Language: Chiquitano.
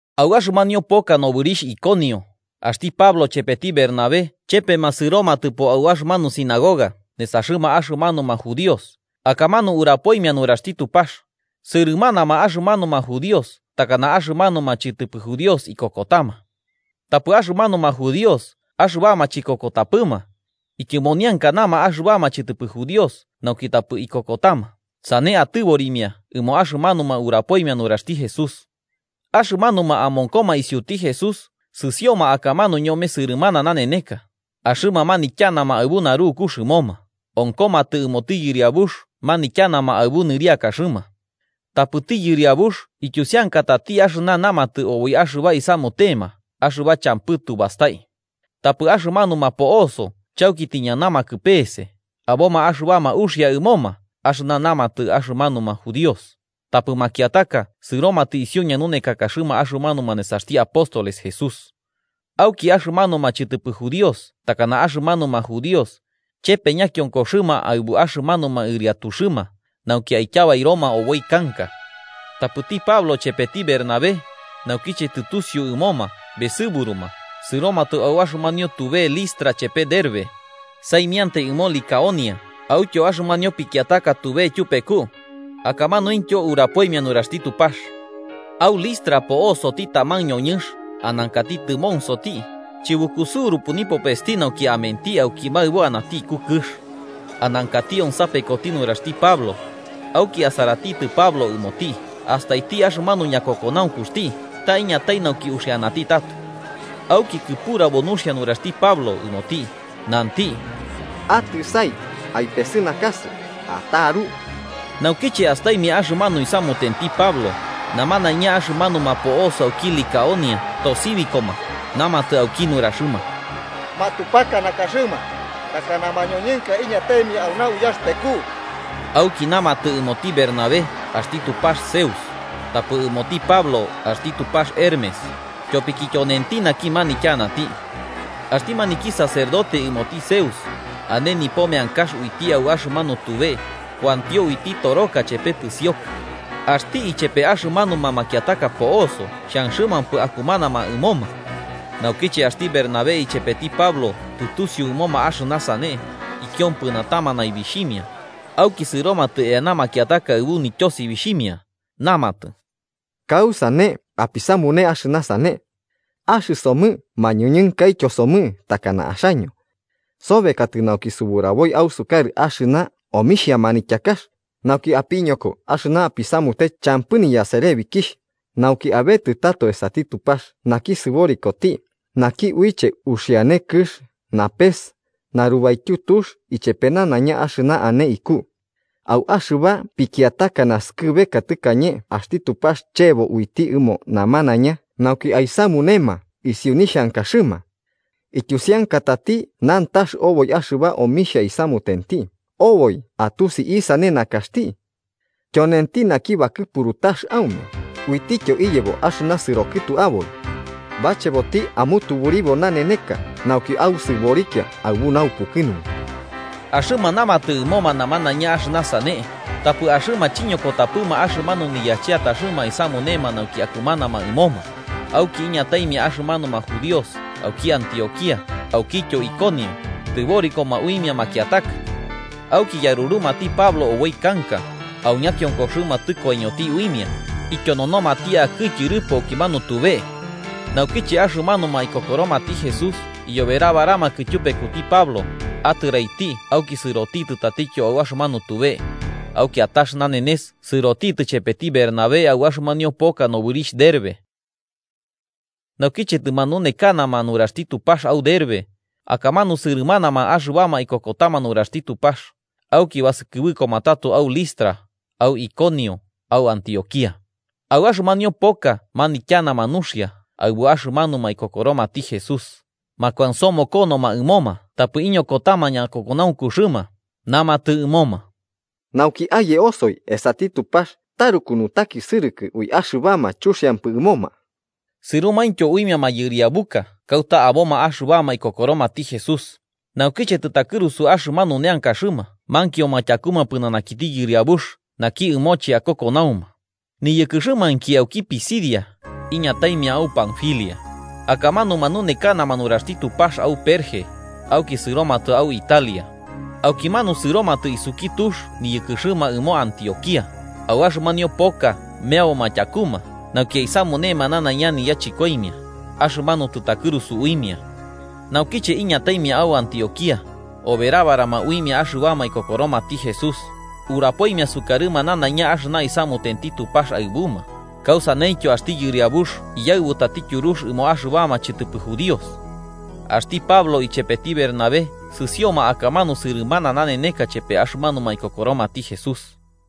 Au axɨmanio poka nobɨrixh Iconio, axti Pablo chepeti Bernabé chepema sɨromatɨpo au axɨmanu sinagoga nesaxɨma axɨmanuma judíos, akamanu urapoimia nuraxti Tupax, sɨrɨmanama axɨmanuma judíos takana axɨmanuma chɨtɨpɨ judíos ikokotama. Tapɨ axɨmanuma judíos axɨbama chikokotapɨma, ityɨmoniankanama axɨbama chɨtɨpɨ judíos nauki tapɨ ikokotama sane atɨborimia ɨmo axɨmanuma urapoimia nuraxti Jesús. Axɨmanuma amonkoma isiuti Jesús, sɨsioma akamanu ñome sɨrɨmana naneneka, axɨma manityanama aɨbu narukux ɨmoma, onkomatɨ ɨmoti Yɨriabux manityanama aɨbu nɨriakaxɨma. Tapɨti Yɨriabux ityusiankatati axɨna namatɨ oboi axɨba isamutema axɨba champɨ tu bastai. Tapɨ axɨmanuma po'oso chauki tiñanamakɨ peese, aboma axɨbama uxia ɨmoma axɨna namatɨ axɨmanuma judíos, tapɨ makiataka sɨromatɨ isiu ñanunekakaxɨma axɨmanuma nesaxti apóstoles Jesús Auki, axɨmanuma chɨtɨpɨ judíos takana axɨmanuma judíos, chepe ñakionkoxɨma aɨbu axɨmanuma ɨriatuxɨma, nauki aityabairoma oboi kanka. Tapɨti Pablo chepeti Bernabé, naukiche tɨtusiu ɨmoma besɨburuma sɨromatɨ au axɨmanio tube Listra chepe Derbe, saimiantai ɨmo Licaonia autyo axɨmanio pikiataka tube tyupeku. Akamanuintyo urapoimia nuraxti Tupax. Au Listra po'osoti taman ñoñɨnx anankati tɨmonsoti, chibukusɨurupɨ nipopesti nauki amenti auki maɨbo anati iku kɨx. Anankati onsapekoti nuraxti Pablo, auki asaratitɨ Pablo ɨmoti astaiti axɨmanu ñakokonaunkuxti ta iñatai nauki uxianati tato. Auki kɨpurabo nuxia nuraxti Pablo ɨmoti, nanti: –¡Atɨsai aipesɨnakasɨ ataru! Naukiche astaimia axɨmanu isamutenti Pablo, namanaiña axɨmanuma po'oso auki Licaonia tosibikoma namatɨ auki nuraxɨma: –¡Matupaka nakaxɨma takana mañoñɨnka iñataimia auna uyaxɨpeku! Auki namatɨ ɨmoti Bernabé axti tupax Zeus, tapɨ ɨmoti Pablo axti tupax Hermes, tyopiki tyonenti naki manityanati. Axti maniki sacerdote ɨmoti Zeus, ane nipo meankax uiti au axɨmanu tube, kuantio uiti toroka chepe pɨsioka. Axti ichepe axɨmanuma makiataka po'oso xhanxɨmampɨ akumanama ɨmoma. Naukiche axti Bernabé ichepeti Pablo tɨtusiu ɨmoma axɨna sane, ikiompɨnatama naibixhimia, auki sɨromatɨ eana makiataka aɨbu nityosibixhimia, namatɨ: 15–¿Kausane apisamune axɨna sane? Axɨsomɨ mañoñɨnkaityo somɨ takana axaño. Sobekatɨ nauki suburaboi ausukarɨ axɨna omixha manityakax, nauki apiñoko axɨna apisamute champɨ niyaserebikixh, nauki abetɨ tato esati Tupax naki sɨborikoti, naki uiche uxiane kɨx, napes, narubaityu tux ichepe nanaiña axɨna ane iku. Au axɨba pikiataka nasɨkɨbeka tɨkañe axti Tupax chebo uiti ɨmo namanaiña nauki aisamunema isiu nixhankaxɨma. Ityusiankatati nantax oboi axɨba omixha isamutenti, oboi atusi isane nakaxti. Tyonenti naki bakɨpuru tax aume, uitityo iyebo axɨna sɨro kɨtu aboi. Bacheboti amutuburibo naneneka nauki ausɨborikia aɨbu naupukɨnunku. Axɨma namatɨ ɨmoma nanaiña axɨna sane, tapɨ axɨma chiñokotapɨma axɨmanu niyacheataxɨma aisamunema nauki akumanama ɨmoma. Auki iñataimia axɨmanuma judíos auki Antioquía aukityo Iconio, tɨborikoma uimia makiataka. Auki yarurumati Pablo oboi kanka, au ñakionkoxɨma tɨkoiñoti uimia, ityononomati akɨ tyɨrɨpo axɨmanu tube. Naukiche axɨmanuma ikokoromati Jesús iyoberabaramakɨ tyupekuti Pablo, atɨraiti auki sɨrotitɨ tatityo au axɨmanu tube. Au kiatax nanenes sɨrotitɨ chepeti Bernabé au axɨmanio poka nobɨrixh Derbe. Naukiche tɨmanunekanama nuraxti Tupax au Derbe, akamanu sɨrɨmanama axɨbama ikokotama nuraxti Tupax. Auki basɨkɨbɨkoma tato au Listra, au Iconio, au Antioquía. Au axɨmanio poka manityanama nuxia aɨbu axɨmanuma ikokoromati Jesús, makuansomokonoma ɨmoma tapɨ iñokotama ñakokonaunkuxɨma, namatɨ ɨmoma, nauki aye osoi esati Tupax taruku nutakisɨrɨkɨ ui axɨbama chuxiampɨ ɨmoma. Sɨromaintyo uimia mayɨriabuka kauta aboma axɨbama ikokoromati Jesús, naukiche tɨtakɨrusu axɨmanu neankaxɨma mankioma tyakuma pɨnanakiti Yɨriabux naki ɨmoche akokonauma. Niyɨkɨxɨmainki auki Pisidia, iñataimia au Panfilia. Akamanu manunekanama nuraxti Tupax au Perge, auki sɨromatɨ au Italia. Aukimanu sɨromatɨ isuki tux niyɨkɨxɨma ɨmo Antioquía, au axɨmanio poka meaboma tyakuma nauki aisamunema nanaiña niyachɨkoimia axɨmanu tɨtakɨrusu uimia. Naukiche iñataimia au Antioquía, oberabarama uimia axɨbama ikokoromati Jesús, urapoimia sukarɨma nanaiña axɨna isamutenti Tupax aɨbuma, kausaneityo axti Yɨriabux iyaɨbutati tyurux ɨmo axɨbama chɨtɨpɨ judíos. Axti Pablo ichepeti Bernabé sɨsioma akamanu sɨrɨmana naneneka chepe axɨmanuma ikokoromati Jesús.